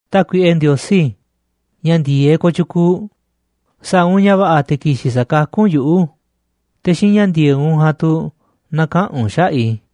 Tákuiꞌe Ndiosí, ña̱ ndi̱e̱eꞌ kooꞌ tyukuuꞌ, sa̱a̱ u̱nꞌ ña̱ va̱ꞌa̱ te̱ ki̱xi̱n sa̱kakú u̱nꞌ yuꞌu̱, te̱ xiinꞌ ña̱ ndi̱e̱eꞌ u̱nꞌ ja̱a̱nꞌ tu̱ na̱kaꞌa̱n u̱nꞌ xaꞌa̱ꞌ i̱.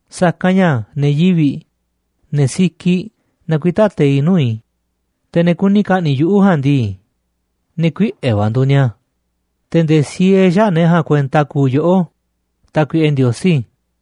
Sa̱kanꞌ ña̱ ne̱ yivi̱ꞌ, ne̱ sikiꞌ, nakuitá teiꞌ nuu̱ꞌ i̱, te̱ ne̱ kuni ka̱ꞌni̱ꞌ yuꞌu̱ ja̱a̱nꞌ ndii, ne̱ kuiꞌe̱ va̱ nduuꞌ ni̱a̱, te̱ nde̱e̱ siee xäaꞌ ne̱ ja̱a̱nꞌ kuenta kuuꞌ yoꞌó, Tákuiꞌe Ndiosí.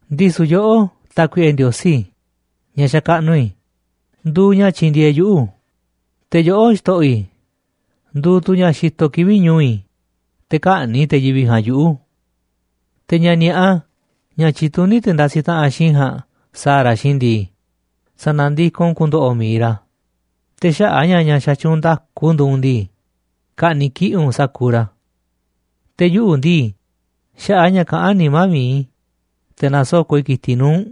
Ndisu̱ yoꞌó, Tákuiꞌe Ndiosí ña̱ xakaꞌnuꞌ i̱, nduuꞌ ña̱ tyindieeꞌ yuꞌu̱, te̱ yoꞌó, Xto̱ꞌo̱ i̱, nduuꞌ tu̱ ña̱ xitoꞌ kivi̱ꞌ ñu̱u̱ i̱, te̱ kä̱ꞌni̱ꞌ te̱ yivi̱ꞌ ja̱a̱nꞌ yuꞌu̱. Te̱ ña̱ ni̱a̱ꞌa, ña̱ tyituní te̱ ndasiꞌ taꞌanꞌ xiinꞌ i̱ ja̱a̱nꞌ sa̱a̱ ra̱ xiinꞌ i̱ ndii, sa̱na̱ndikoꞌ u̱nꞌ ku̱ndo̱ꞌo̱ mi̱iꞌ ra̱, te̱ xaꞌa̱ꞌ a̱ ña̱ ña̱ xatyuunꞌ nda̱ku nduuꞌ u̱nꞌ ndii, ka̱ꞌni̱ꞌ kiꞌi̱ꞌ u̱nꞌ sa̱kuuꞌ ra̱. Te̱ yuꞌu̱ ndii, xaꞌa̱ꞌ a̱ ña̱ kaꞌán nimá mi̱iꞌ i̱, te̱ na̱soko̱ꞌ i̱ ki̱tiꞌ nuu̱ꞌ u̱nꞌ,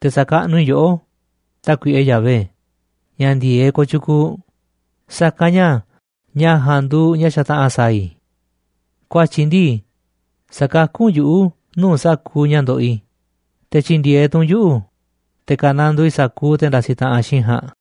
te̱ sa̱kaꞌnuꞌ i̱ yoꞌó, Tákuiꞌe Yahvé, ña̱ ndi̱e̱eꞌ kooꞌ tyukuuꞌ, sa̱kanꞌ ña̱ ña̱ ja̱a̱nꞌ nduuꞌ ña̱ xataꞌa̱n sa̱a̱ i̱. Ku̱a̱tyi̱ ndii, sa̱kakú u̱nꞌ yuꞌu̱ nuu̱ꞌ sa̱kuuꞌ ña̱ ndoꞌoꞌ i̱, te̱ tyi̱ndi̱e̱eꞌ tu̱ u̱nꞌ yuꞌu̱, te̱ ka̱nandoo i̱ sa̱kuuꞌ te̱ ndasiꞌ taꞌanꞌ xiinꞌ i̱ ja̱a̱nꞌ.